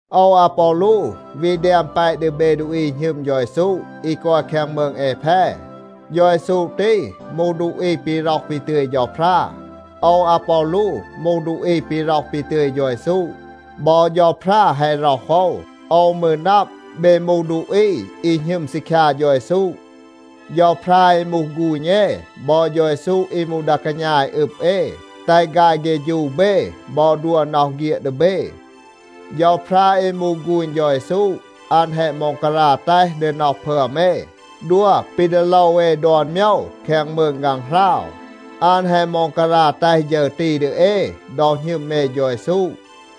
โอว อาปอลู วี แดม แปะ ดี เบ ดูอี อี หณึม เฌา เยซู อี กอย แคง มืง แอแพ. เฌา เยซู ตี มูห ดูอี ปี ร็อห ปี ตึย เฌาพรา. โอว อาปอลู มูห ดูอี ปี ร็อห ปี ตึย เฌา เยซู. บอ เฌาพรา แฮะ ร็อห โอว. โอว มืร นับ, เบ มูห ดูอี อี หณึม ซีคยา เฌา เยซู. เฌาพรา อี มูห ฆูณ เอ บอ เฌา เยซู อี มูห ดา กาณา อี อึบ เอ, แตห ฆาย เฆฌู เบ บอ ดัว น็อห เฆียด ดี เบ. เฌาพรา อี มูห ฆูณ เฌา เยซู, อัน แฮะ ม็องการา แตห ดี น็อห พึอม เอ, ดัว ปี ดี โลว เอ ดอน โมยว แคง มืง ฆางหราว. อัน แฮะ ม็องการา แตห ฌึร ตี ดี เอ ดอ หณึม เอ เฌา เยซู.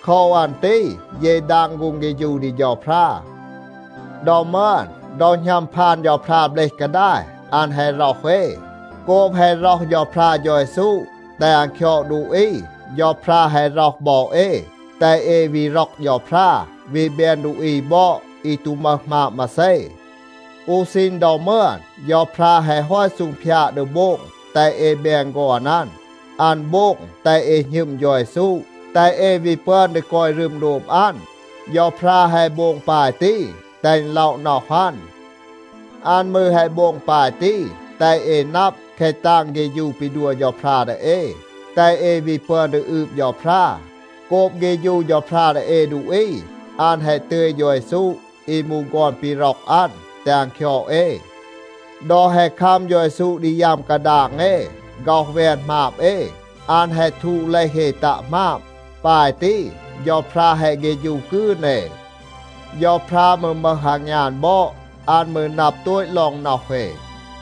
โคว อัน ตี เย ดาง ฆูง เฆฌู ดี เฌาพรา. ดอ มึอน, ดอ หณัม พาน เบลห เฌาพรา กาดาย, อัน แฮะ ร็อห เอ. โกบ แฮะ ร็อห เฌาพรา เฌา เยซู, แตห อัน คยอด ดูอี, เฌาพรา แฮะ ร็อห บอ เอ, แตห เอ วี ร็อก เฌาพรา, วี แบน ดูอี บอด, อี ตู มึห หมาบ มาเซ. อู ซีณ ดอ มึอน เฌาพรา แฮะ ฮอต ซูงพยาด ดี โบง แตห เอ แบน ฆอน อัน. อัน โบง แตห เอ หณึม เฌา เยซู, แตห เอ วี ปึอน ดี กอย รึม โดบ อัน. เฌาพรา แฮะ โบง ปาย ตี, แตห อึณ ล็อะ น็อห อัน. อัน มืร แฮะ โบง ปาย ตี, แตห เอ นับ แคะ ตาง เฆฌู ปี ดัว เฌาพรา ดี เอ, แตห เอ วี ปึอน ดี อืบ เฌาพรา. โกบ เฆฌู เฌาพรา ดี เอ ดูอี, อัน แฮะ ตึย เฌา เยซู อี มูห ฆอน ปี ร็อก อัน, แตห อัน คยอด เอ. ดอ แฮะ คัม เฌา เยซู ดี ยัม กาดาง เอ, ฆ็อห แวน หมาบ เอ, อัน แฮะ ทูด เลห เอ ตัะ หมาบ. ปาย ตี เฌาพรา แฮะ เฆฌู กืน เอ. เฌาพรา มืร มึห อางยาน บอด. อัน มืร นับ โตต ลอง น็อห เอ.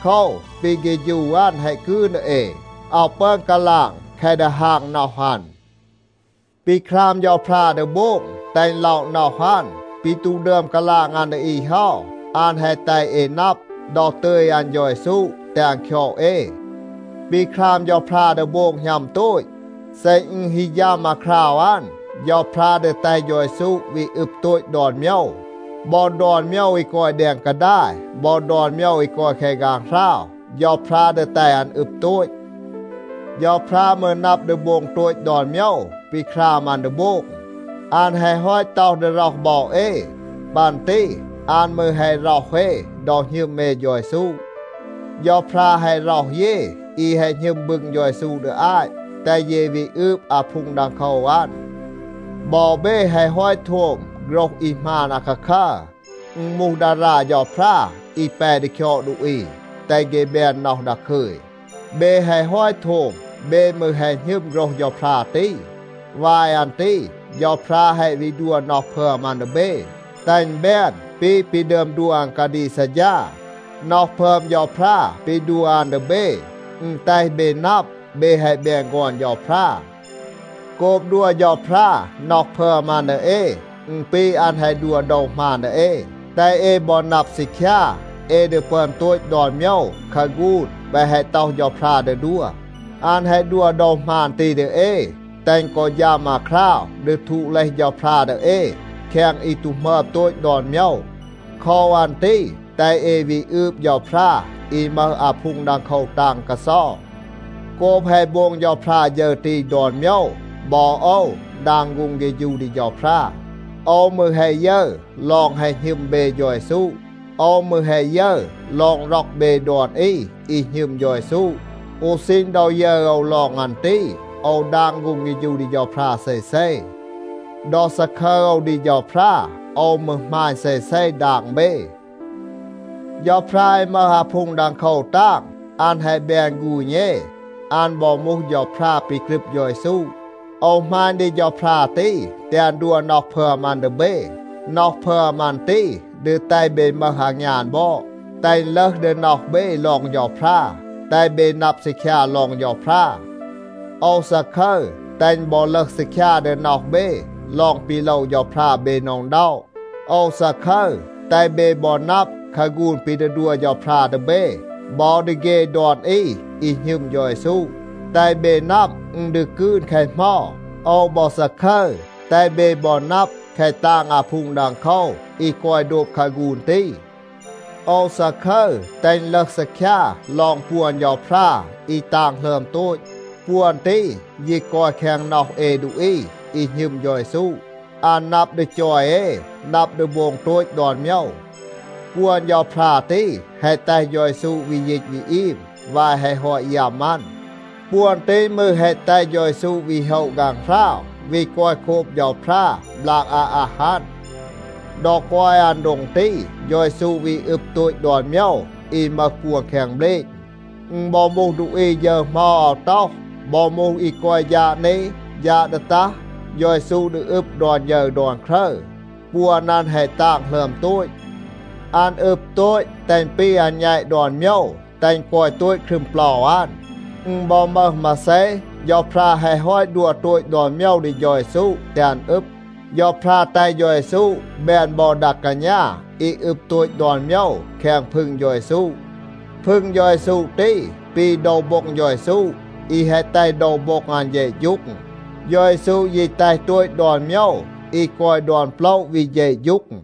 โคว, ปี เฆฌู อัน แฮะ กืน ดี เอ. อาว ปึอน กาลาง แคะ ดีฮาง น็อห อัน. ปี คราม เฌาพรา ดี โบง, แตห อึณ ล็อะ น็อห อัน, ปี ตู ดึอม กาลาง อัน ดี อี เฮา, อัน แฮะ แตห เอ นับ ดอ ตึย อัน เฌา เยซู, แตห อัน คยอด เอ. ปี คราม เฌาพรา ดี โบง หณัม โตต. เซ อึณ ฮี ฌัม อาคราว อัน, เฌาพรา ดี แตห เฌา เยซู วี อึบ โตต ดอน โมยว. บอ ดอน โมยว อี กอย แดง กาดาย, บอ ดอน โมยว อี กอย แคง ฆางหราว, เฌาพรา ดี แตห อัน อึบ โตต. เฌาพรา มืร นับ ดี โบง โตต ดอน โมยว ปี คราม อัน ดี โบง. อัน แฮะ ฮอต ต็อห ดี ร็อห บอ เอ. ปัน ตี อัน มืร แฮะ ร็อห เอ ดอ หณึม เอ เฌา เยซู. เฌาพรา แฮะ ร็อห เย, อี แฮะ หณึม บึง เฌา เยซู ดี อาต, แตห เย วี อืบ อาพูง ดังโคว อัน. บอ เบ แฮะ ฮอต โทม โฆรห อี หมาน อาคาคัร. อึณ มูห ดารา เฌาพรา อี แป ดี คยอด ดูอี, แตห เฆ แบน น็อห ดาคึย. เบ แฮะ ฮอต โทม, เบ มืร แฮะ หณึม โฆรห เฌาพรา ตี. วาย อัน ตี เฌาพรา แฮะ วี ดัว น็อห พึอม อัน ดี เบ, แตห อึณ แบน ปี ปี ดึอม ดัว อัน กาดีก ซัดฌา. น็อห พึอม เฌาพรา ปี ดัว อัน ดี เบ, อึณ แตห เบ นับ, เบ แฮะ แบน ฆอน เฌาพรา. โกบ ดัว เฌาพรา น็อห พึอม อัน ดี เอ, อึณ ปี อัน แฮะ ดัว โดว หมาน ดี เอ, แตห เอ บอ นับ ซีคยา, เอ ดี ปึอน โตต ดอน โมยว คาฆูน แปะ แฮะ ต็อห เฌาพรา ดี ดัว. อัน แฮะ ดัว โดว หมาน ตี ดี เอ, แตห อึณ กอ ฌัม อาคราว ดี ทูด เลห เฌาพรา ดี เอ แคง อี ตู หมึอม โตต ดอน โมยว. โคว อัน ตี แตห เอ วี อืบ เฌาพรา อี มึห อาพูง ดังโคว ตาง กาเซา. โกบ แฮะ โบง เฌาพรา ฌึร ตี ดอน โมยว, บอ โอว ดาง ฆูง เฆฌู ดี เฌาพรา. โอว มืร แฮะ ยึร ลอง แฮะ หณึม เบ เฌา เยซู. โอว มืร แฮะ ยึร ลอง ร็อก เบ ดอน อี อี หณึม เฌา เยซู. อู ซีณ ดอ ยึร โอว ลอง อัน ตี, โอว ดาง ฆูง เฆฌู ดี เฌาพรา เซเซ. ดอ ซาคึร โอว ดี เฌาพรา, โอว มืร หมาณ เซเซ ดาง เบ. เฌาพรา อี มึห อาพูง ดังโคว ตาง, อัน แฮะ แบน ฆูณ เอ. อัน บอ มูห เฌาพรา ปี กรึบ เฌา เยซู. โอว หมาณ ดี เฌาพรา ตี, แตห อัน ดัว น็อห พึอม อัน ดี เบ. น็อห พึอม อัน ตี ดี แตห เบ มึห อางยาน บอด, แตห อึณ ลึห ดี น็อห เบ ลอง เฌาพรา, แตห เบ นับ ซีคยา ลอง เฌาพรา. โอว ซาคึร, แตห อึณ บอ ลึห ซีคยา ดี น็อห เบ ลอง ปี โลว เฌาพรา เบ หน็อะ อึณด็อะ. โอว ซาคึร, แตห เบ บอ นับ คาฆูน ปี ดี ดัว เฌาพรา ดี เบ บอ ดี เฆ ดอน อี อี หณึม เฌา เยซู. แตห เบ นับ, อึณ ดี กืน แคะ เหมา. โอว บอ ซาคึร, แตห เบ บอ นับ แคะ ตาง อาพูง ดังโคว อี กอย โดบ คาฆูน ตี. โอว ซาคึร แตห อึณ ลึห ซีคยา ลอง ปวน เฌาพรา อี ตาง หลึอม โตต. ปวน ตี ยี กอย แคง น็อห เอ ดูอี อี หณึม เฌา เยซู. อัน นับ ดี จอย เอ, นับ ดี โบง โตต ดอน โมยว. ปวน เฌาพรา ตี แฮะ แตห เฌา เยซู วี ยีต วี อีม วาย แฮะ ฮอต ยัม อัน. ปวน ตี มืร แฮะ แตห เฌา เยซู วี โฮะ ฆางหราว, วี กอย โคบ เฌาพรา บลาก อาอัห อัน. ดอ กอย อัน โดง ตี, เฌา เยซู วี อึบ โตต ดอน โมยว อี มึห ปวน แคง เบลณ. อึณ บอ มูห ดูอี ฌึร เหมา อาว ต็อห, บอ มูห อี กอย ฌาด นี, ฌาด ดี ตัห, เฌา เยซู ดี อึบ ดอน ฌึร ดอน ครึร. ปวน อัน แฮะ ตาง หลึอม โตต. อัน อึบ โตต, แตห อึณ ปี อัน แณต ดอน โมยว, แตห อึณ กอย โตต ครึม เปลา อัน. อึณ บอ มึห มาเซ, เฌาพรา แฮะ ฮอต ดัว โตต ดอน โมยว ดี เฌา เยซู แตห อัน อึบ. เฌาพรา แตห เฌา เยซู แบน บอ ดา กาณา อี อึบ โตต ดอน โมยว แคง พึง เฌา เยซู. พึง เฌา เยซู ตี ปี โดว โบ็ง เฌา เยซู อี แฮะ แตห โดว โบ็ง อัน เฌะฌูง. เฌา เยซู ยี แตห โตต ดอน โมยว อี กอย ดอน โปละ วี เฌะฌูง.